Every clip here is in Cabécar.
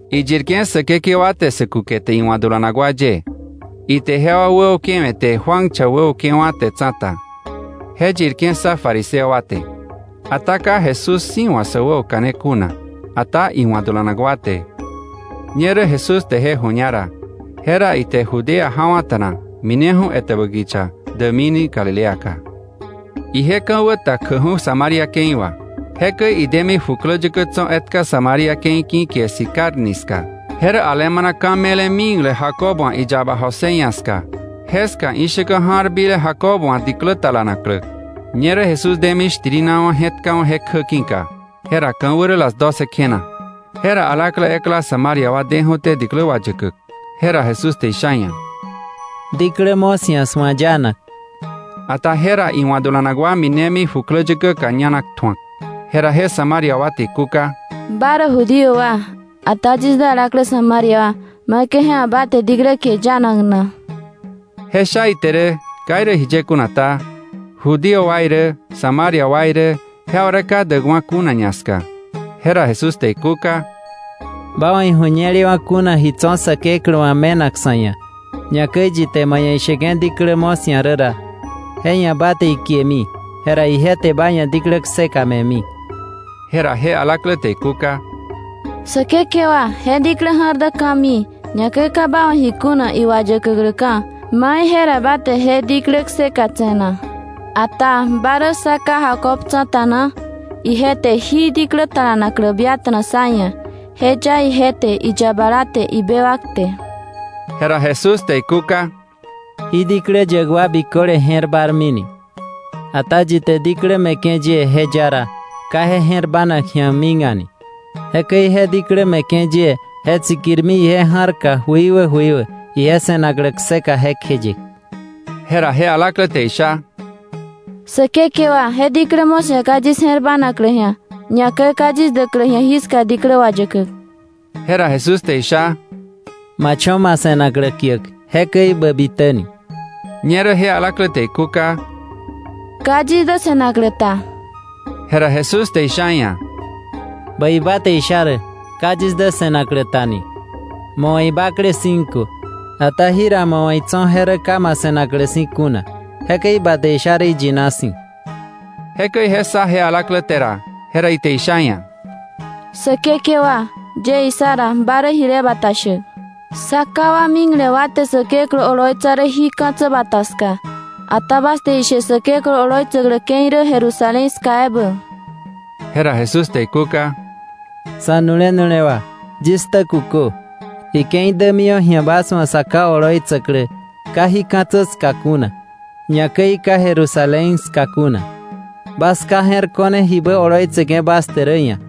Iyirke̱ Säkekewa te sä kukete iwa̱ dulanak wa ye, ite jewa wäukewe̱te Juan cha wäukewa̱te tsa̱ta. Je yirke̱ ssa fariseo wa te (ata ka Jesús si̱ wa̱ sä wäoka̱ne kuna, ata iwa̱ dulanak wa te.) Ñerä Jesús te je ju̱ña ra, jera ite Judea jawa̱ta̱na mineju̱ etäbä kicha däkmini Galileaka. Ije ka̱wä ta kjäkju̱ Samaria ke̱i wà. Jekäi idemi jukläyäkä tso̱ etka Samaria ke̱i ki̱ kie Sicar ni ska. Je rä alemana ka̱ me̱le mikle Jacob wa̱ iyaba José ia̱ ska. Jeska ishäkä ja̱r bile Jacob wa̱ diklä talanaklä. Ñerä Jesús demi shtirinawa̱ je̱tkawa̱ je kjä ki̱ka. Jera ka̱wä rä las doce kjena. Jera alaklä ekla Samaria wa deju̱té diklä wayäkäk. Jera Jesús te isha iia̱: —Diklä mo̱ 'sia̱ 'swa̱ yanak. Ata jera iwa̱ dulanak wa minemi jukläyäkäka ñanak tju̱ak. Jera je Samaria wa te ikúka: —¿Ba rä Judío wa, ata yis dä alaklä Samaria wa, maikäi je ia̱ ba te diklä kie yanak na? Je sha ite rä, ka jiye kuna ta, Judío wa irä, Samaria wa irä, jewa rä ka däkwa̱ kuna ñaska. Jera Jesús te ikúka: —Ba wa̱ iju̱ñelewa̱ kuna ji tso̱ Säkeklä wa̱ me̱nak sa̱ ia̱, ñakäi yi te ma ia̱ isheke̱ diklä mo̱ 'sia̱ rä ra, je ia̱ ba te ikiemi, jera ije te ba ia̱ diklä kseka me̱mi. Jera je alaklä te ikúka: —Säkekewa, je diklä ja̱r dä ka̱mii, ñakäi ka ba wa̱ ji kuna iwayäkäkläka̱. ¿Mai jera ba te je diklä kseka tse̱ na? Ata ¿ba rä sá ká Jacob tsa̱ta na? Ije te jí diklä talanaklä biata̱na sá ia̱. Je ya ije te, iyabala te, ibewak te. Jera Jesús te ikúka: —Jí diklä yäk wa biköle je̱r bármi ni, ata yi te diklä me̱ke̱ yie je ya ra, ka je je̱r bának ji̱a mik a̱ni. Jekäi je diklä me̱ke̱ yie je tsikirmi ije ja̱rka jöikwä jöikwä, ije se̱naklä kseka jekjeye. Jera je alaklä te isha: —Säkekewa, je diklä mo̱ 'sia̱ ka yis je̱r bánaklä ji̱a, ñakäi ka yis däklä ji̱a jiska diklä wayäkäk. Jera Jesús te isha: —Ma cho̱ ma se̱naklä kiäk, jekäi bä bitäni. Ñerä je alaklä te ikúka: —Ka yis dä se̱naklä ta. Jera Jesús te isha iia̱: —Bäi ba te isha rä, ka yis dä se̱naklä ta ni. Ma wa̱ ibakle cinco, ata jira ma wa̱ itso̱ je rä ka ma se̱naklä si̱ kuna. Jekäi ba te isha rä iyina si̱. Jekäi je ssa je alaklä te ra, jera ite isha iia̱: —Säkekewa, yie issa ra, ba rä jile bata shäk. Sá ká wa mikle wa te Säkeklä oloitsa rä jí ka̱tsä bata ska, ata bas te ishe Säkeklä oloitsäklä ke̱i rä Jerusalén ska ebä. Jera Jesús te ikúka: —Sa̱nu̱le nu̱lewa, yis ktä kukö. Ike̱i dämiwa̱ ji̱a bas wa̱ Sa Ká oloitsäklä ka jí ka̱tsä ska kuna, ñakäi ka Jerusalén ska kuna. Bas ka je̱r ko̱ne jibä oloitseke̱ bas te rä ia̱,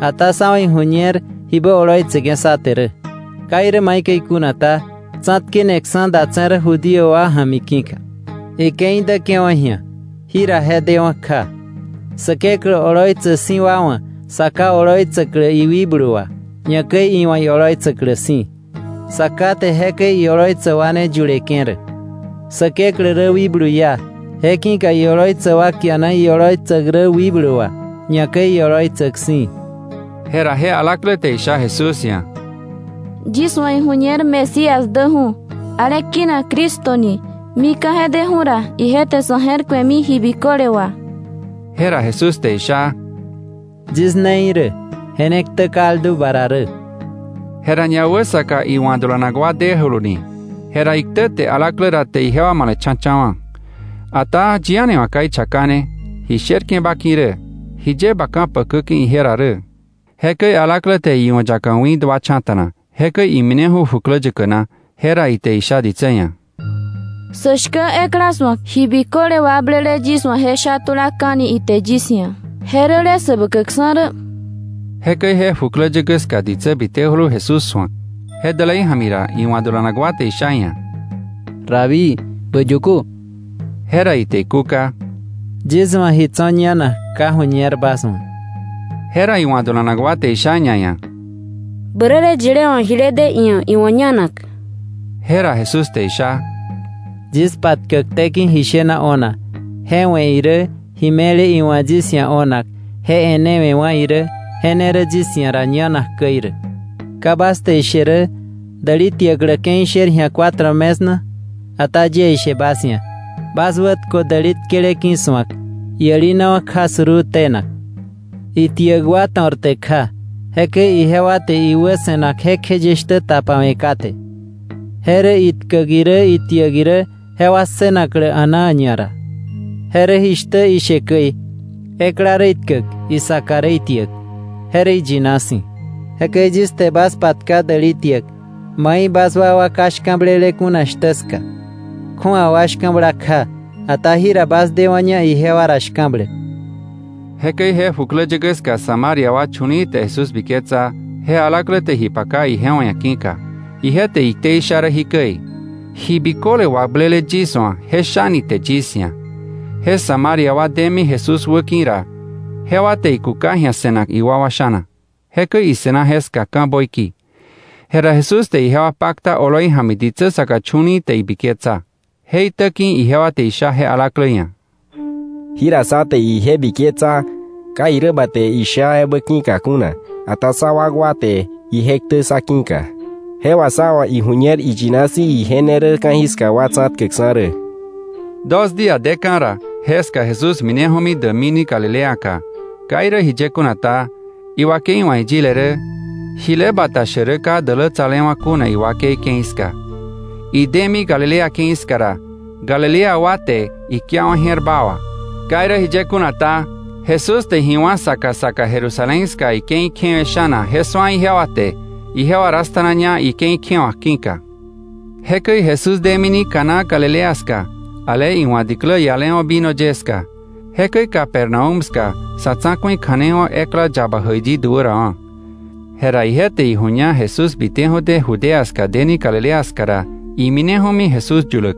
ata sá wa̱ iju̱ñer jibä oloitseke̱ sá te rä. Ka irä maikäi kuna ta, tsa̱tkeneksa̱ datse̱ rä Judío wa ja̱mi ki̱ka. Ike̱i däke̱wa̱ ji̱a, jira je dewa̱ kja, Säkeklä oloitsäk si̱ wa wa̱ Sa Ká oloitsäklä iwikblu wà, ñakäi iwa̱ ioloitsäklä si̱. Sa Ká te jekäi ioloitsäk wa ne yuleke̱ rä. Säkeklä rä wikblu iá. Je ki̱ka ioloitsäk wa kiana ioloitsäk rä wikblu wà, ñakäi ioloitsäk si̱. Jera je alaklä te isha Jesús ia̱: —Yis wa̱ iju̱ñer Mesías däju̱, ale kinak Cristo ni. Mika̱ je deju̱ ra, ije te sa̱ je̱r ku̱emi ji biköle wà. Jera Jesús te isha: —Yis ne irä, je ne ktä kaldu ba ra rä. Jera ñawäsaka iwa̱ dulanak wa dejuluni. Jera iktäte alaklä ra te ijewa male̱cha̱cha̱wa̱. Ata yi a̱ni wa̱ ka ichakane: “¿Ji sherke̱ ba ki̱ rä?” “¿Jiye ba ka̱pakäke̱ ije ra rä?” Jekäi alaklä te iu̱yaka wi̱ duacha̱ta̱na. Jekäi imineju̱ jukläyäkä na. Jera ite isha ditsä ia̱: —Sä shkä ekla su̱ak. Ji biköle wakblele yis wa̱ je sha tulaka̱ni ite yis ia̱. Je rä le Säbäkäkksa̱ rä. Jekäi je jukläyäkä ska ditsä bitejulu Jesús su̱ak. Je dälei ja̱mi ra iwa̱ dulanak wa te isha iia̱: —Rabí, bä yäkö. Jera ite ikúka: —Yis wa̱ ji tso̱ ñanak ka ju̱ñer bas wa̱. Jera iwa̱ dulanak wa te isha ñaia̱: —Bäräle yilé wa̱ jile de iia̱ iwa̱ ñanak. Jera Jesús te isha: —Yis patkäkté ki̱ ji shena o̱nak je we̱ irä, ji me̱le iwa̱ yis ia̱ o̱nak je e̱newe̱wa̱ irä, je ne rä yis ia̱ ra ñanak käi rä. ¿Ka irä bas te ishe: ‘Däli tiäklä ke̱i sher ji̱a rä cuatro mes’ na? Ata yie ishe bas ia̱, bas wätkö däli tkele ki̱su̱ak, iälinawa̱ kja suruu tenak. Itiäk wa to̱rte̱ kja. Jekäi ijewa te iwä se̱nak jekjeye shtä tapawe̱ kate. Je rä itkäk irä itiäk irä jewa ssënaklä a̱naa ñara. Je rä jishtä ishe käi: ‘Ekla rä itkäk, isaka rä itiäk.’ Je rä iyina si̱. Jekäi yis te bas patka däli tiäk, mai bas wakwa ka shka̱blele kuna shtä ska. Kju̱awa wa shka̱bla kja, ata jira bas dewa̱ña ijewa ra shka̱bläk. Jekäi je jukläyäkä ska Samaria wa chu̱li̱i̱ te Jesús biketsa je alaklä te ji paka ijewa ia̱ ki̱ka. Ije te iktei sha rä jikäi: “Ji biköle wakblele yis wa̱ je shani ite yis ia̱.” Je Samaria wa demi Jesús wäki̱ ra, jewa te ikuka ji̱a se̱nak iwakwa sha̱na. Jekäi ise̱na jeska ka̱ böiki. Jera Jesús te ijewa pakta oloi ja̱mi ditsä saka chu̱li̱i̱ te ibiketsa. Je itä ki̱ ijewa te isha je alaklä ia̱: —Jira sá te ije biketsa, ka irä ba te isha ebä ki̱ka kuna, ata sá wakwa te ije ktä ssa ki̱ka. Je wà sá wa̱ iju̱ñer iyina si̱ ije ne rä ka̱jiska wa tsa̱tkäkksa̱ rä. Dos día deka̱ ra, jeska Jesús mineju̱mi däkmini Galileaka. Ka irä jiye kuna ta, iwakei wa̱ iyile rä: “Jile bata shäk rä ka dälätsalewa̱ kuna iwakei ke̱i ska.” Idemi Galilea ke̱i ska ra, Galilea wa te ikiawa̱ je̱r baa wà. Ka irä jiye kuna ta, Jesús te ji wá̱ saka saka Jerusalén ska ike̱i kjewe̱ sha̱na je su̱a ijewa te, ijewa dasta̱naña ike̱i kjewa̱k ki̱ka. Jekäi Jesús demini Caná Galilea ska, ale iwa̱ diklä ialewa̱ vino ye ska. Jekäi Capernaúm ska sa̱ tsa̱ku̱i kja̱nei wa̱k ekla yaba jäiyi duärawa̱. Jera ije te iju̱ña Jesús biteju̱té Judea ska deni Galilea ska ra, imineju̱mi Jesús yuläk.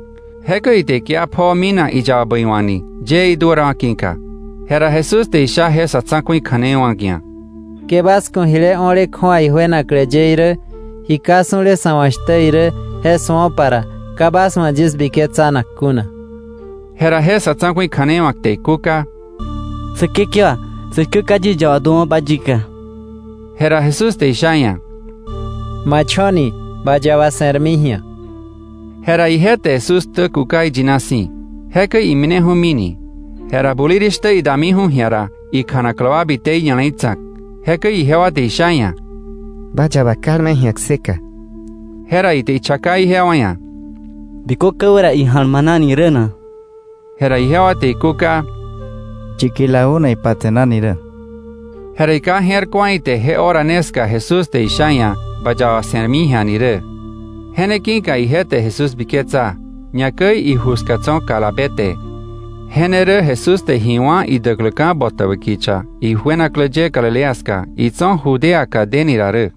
Jekäi ite ikia pjoo minak iyaba bäiwa̱kni, yëë iduärawa̱ ki̱ka. Jera Jesús te isha je sa̱ tsa̱ku̱i kja̱nei wa̱k ia̱: —Ke bas ku̱ jile o̱le kju̱awa ijuenaklä ye irä, ji ka su̱le sa̱ wa̱ shtä irä, je su̱opa ra, ka bas wa̱ yis biketsanak kuna. Jera je sa̱ tsa̱ku̱i kja̱nei wa̱k te ikúka: —Säkekewa, sä shkä ka yis yaba duäwa̱ba yika. Jera Jesús te isha iia̱: —Ma cho̱ni. Ba yaba se̱rmi ji̱a. Jera ije te Jesús ktä kuka iyina si̱. Jekäi imineju̱mini. Jera bulirishtä idamiju̱ ji̱a ra, ikjanaklä wa bite iña̱le̱i tsa̱k. Jekäi ijewa te isha iia̱: —Ba yaba kalme ji̱a kseka. Jera ite ichaka ijewa ia̱: —¿Bikö ka̱wä ra ija̱lmanani rä na? Jera ijewa te ikúka: —Yiki la una ipatse̱nani rä. Jera iká je̱r ku̱a ite je hora ne ska Jesús te isha iia̱: “Ba yaba se̱rmi ji̱a” ni rä. Je ne ki̱ka ije te Jesús biketsa, ñakäi iju ska tso̱ kalabe te. Je ne rä Jesús te ji wá̱ idäkläka̱ botäbä kicha ijuenaklä ye Galilea ska, itso̱ Judeaka deni ra rä.